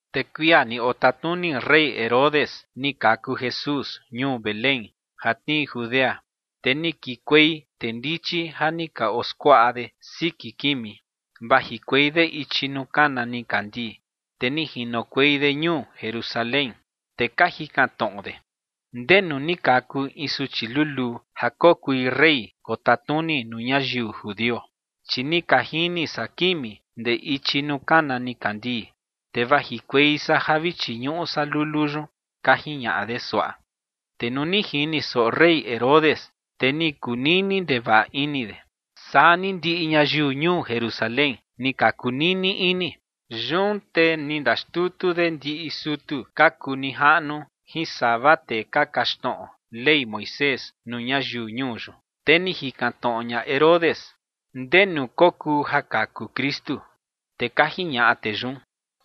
Te kuia ni otatnuni rey Herodes, ni kaku Jesús ñuu Belén ja tnii Judea, te ni kikuei tee ndichi ja ni ka oskuaꞌa de siki kimi, vajikuei de ichi nuu kana nikandii, te ni jinokuei de ñuu Jerusalén. Te ka jikan tnoꞌo de: ͏―͏¿Ndenu ni kaku in suchi luluu ja kokui rey kotatnuni nuu ñayiu judio? Chi ni ka jini san kimi ndee ichi nuu kana nikandii, te vajikuei san ja vi chiñuꞌu san lulu yun ͏―͏ka jiñaꞌa de suaꞌa. Te nuu ni jini soꞌo rey Herodes, te ni kunini ndevaꞌa ini de, saa ni ndiꞌi ñayiu ñuu Jerusalén ni ka kunini ini. Yun te ni ndaxtutu de ndiꞌi sutu ka kuu nijaꞌnu jin sava tee ka kaxtnoꞌo Ley Moisés nuu ñayiu ñuu yun, te ni jikan tnoꞌo ña Herodes ndenu kokuu ja kaku Kristu. Te ka jiñaꞌa tee yun: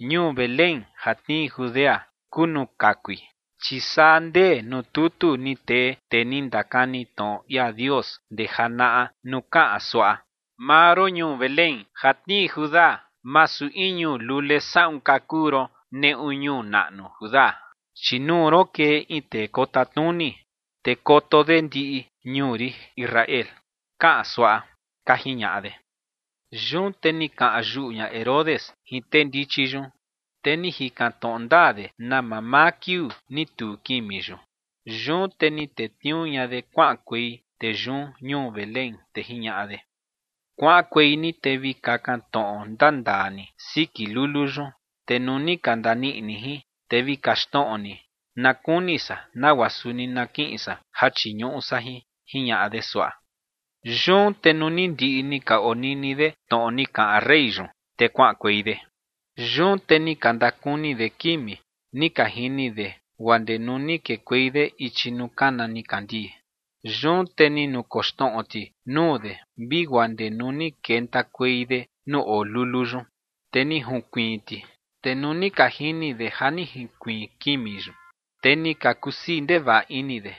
͏―͏Ñuu Belén ja tnii Judea kuu nuu kakui, chi saa ndee nuu tutu ni tee tee ni ndakani tnoꞌo ia Dios ndee janaꞌa nuu kaꞌan suaꞌa: Maa ron, ñuu Belén, ja tnii Judá, masu in ñuu lule saꞌun ka kuu ron neꞌu ñuu naꞌnu Judá, chi nuu ron kee in tee kotatnuni te koto de ndiꞌi ñuu rin Israel, kaꞌan suaꞌa ͏―͏ka jiñaꞌa de. Yun te ni kaꞌan yuꞌu ña Herodes jin tee ndichi yun, te ni jikan tnoꞌo ndaa de na mamaa kiuu ni tuu kimi yun. Yun te ni tetniuu ña de kuaꞌankuei tee yun ñuu Belén, te jiñaꞌa de: ͏―͏Kuaꞌankuei ni te vi kakan tnoꞌo ndandaa ni siki lulu yun, te nuu ni ka ndaniꞌi ni jin, te vi kaxtnoꞌo ni, na kuni san nagua suni na kiꞌin san ja chiñuꞌu san jin ͏―͏jiñaꞌa de suaꞌa. Yun te nuu ni ndiꞌi ni ka onini de tnoꞌo ni kaꞌan rey yun, te kuaꞌankuei de. Yun te ni ka ndakuni de kimi ni ka jini de guaa ndee nuu ni kekuei de ichi nuu kana nikandii. Yun te ni nukoxtnoꞌo ti nuu de vi guaa ndee nuu ni kentakuei de nuu oo lulu yun, te ni junkuiin ti. Te nuu ni ka jini de ja ni jinkuiin kimi yun, te ni ka kusii ndevaꞌa ini de.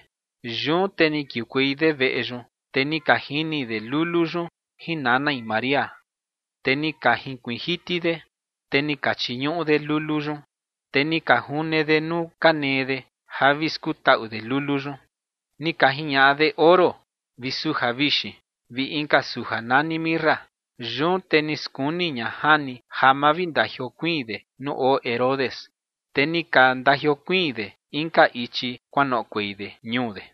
Yun te ni kiukuei de veꞌe yun, te ni ka jini de lulu yun jin nanai María, te ni ka jinkuiin jiti de, te ni ka chiñuꞌu de lulu yun, te ni ka june de nuu ka nee de ja vi skutaꞌu de lulu yun. Ni ka jiñaꞌa de oro vi suja vixin vi inka suja nani mirra. Yun te ni skuni ña jani ja ma vi ndajiokuiin de nuu oo Herodes, te ni ka ndajiokuiin de inka ichi kuanoꞌokuei de ñuu de.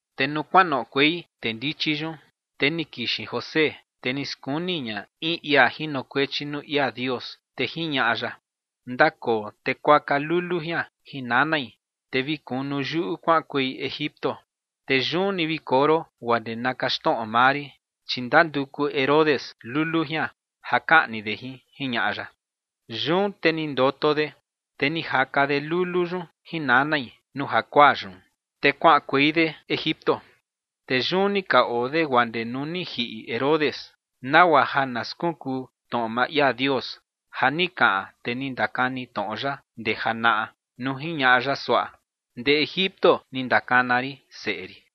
Te nuu kuanoꞌokuei tee ndichi yun, te ni kixin José, te ni skuni ña in ia jinokuechi nuu ia Dios, te jiñaꞌa ya: “Ndakoo te kuaka lulu jian jin nanai, te vi kunu yuꞌu kuaꞌankuei Egipto. Te yun ni vi koo ron guaa ndee na kaxtnoꞌo maa rin, chi ndanduku Herodes lulu jian ja kaꞌni de jin”, jiñaꞌa ya. Yun te ni ndoto de, te ni jaka de lulu yun jin nanai nuu jakuaa yun, te kuaꞌankuei de Egipto. Te yun ni ka oo de guaa ndee nuu ni jiꞌi Herodes, nagua ja na skunkuu tnoꞌo maa ia Dios ja ni kaꞌan tee ni ndakani tnoꞌo ya ndee janaꞌa nuu jiñaꞌa ya suaꞌa: “Ndee Egipto ni ndakana rin seꞌe rin”.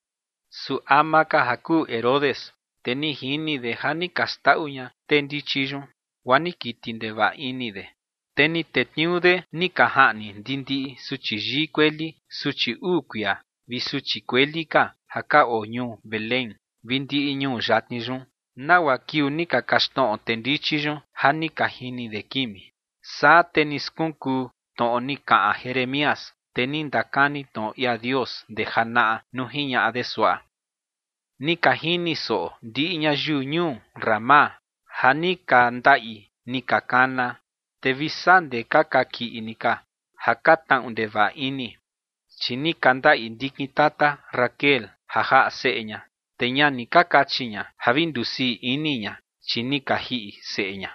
Su ama ka ja kuu Herodes, te ni jini de ja ni ka xndaꞌu ña tee ndichi yun, guaa ni kiti ndevaꞌa ini de. Te ni tetniuu de ni ka jaꞌni ndindiꞌi suchi yii kueli, suchi uu kuia, vi suchi kueli ka ja ka oo ñuu Belén vi ndiꞌi ñuu yatni yun, nagua kiuu ni ka kaxtnoꞌo tee ndichi yun ja ni ka jini de kimi. Saa te ni skunkuu tnoꞌo ni kaꞌan Jeremías, tee ni ndakani tnoꞌo ia Dios ndee janaꞌa nuu jiñaꞌa de suaꞌa: Ni ka jini soꞌo ndiꞌi ñayiu ñuu Ramá ja ni ka ndaꞌi ni ka kana, te vi saa ndee ka kakiꞌi ni ka ja ka tnaꞌu ndevaꞌa ini, chi ni ka ndaꞌi ndikin tata Raquel ja jaꞌa seꞌe ña, te ña ni ka kachi ña ja vi ndusii ini ña, chi ni ka jiꞌi seꞌe ña.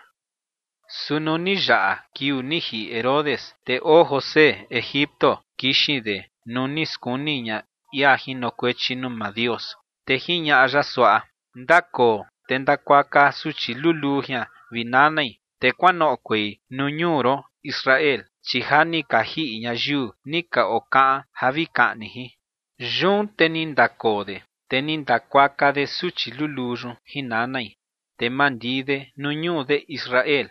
Su nuu ni yaꞌa kiuu ni jiꞌi Herodes, te oo José Egipto, kixin de nuu ni skuni ña ia jinokuechi nuu maa Dios, te jiñaꞌa ya suaꞌa: “Ndakoo te ndakuaka suchi luluu jian vi nanai, te kuanoꞌokuei nuu ñuu ron Israel, chi ja ni ka jiꞌi ñayiu ni ka okaꞌan ja vi kaꞌni jin”. Yun te ni ndakoo de, te ni ndakuaka de suchi luluu yun jin nanai, te mandii de nuu ñuu de Israel.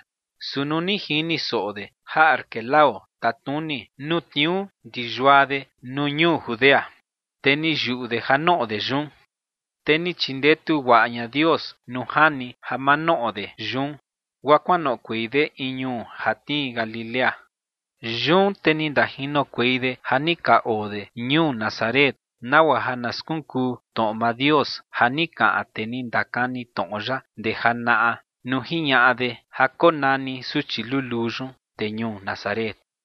Su nuu ni jini soꞌo de ja Arquelao tatnuni nuu tniuu ndi yua de nuu ñuu Judea, te ni yuꞌu de ja noꞌo de yun. Te ni chindetu guaꞌa ña Dios nuu jani ja ma noꞌo de yun, guaa kuanoꞌokuei de in ñuu ja tnii Galilea. Yun te ni ndajinokuei de ja ni ka oo de ñuu Nazaret, nagua ja na skunkuu tnoꞌo maa Dios ja ni kaꞌan tee ni ndakani tnoꞌo ya ndee janaꞌa nuu jiñaꞌa de ja konani suchi luluu yun “tee ñuu Nazaret”.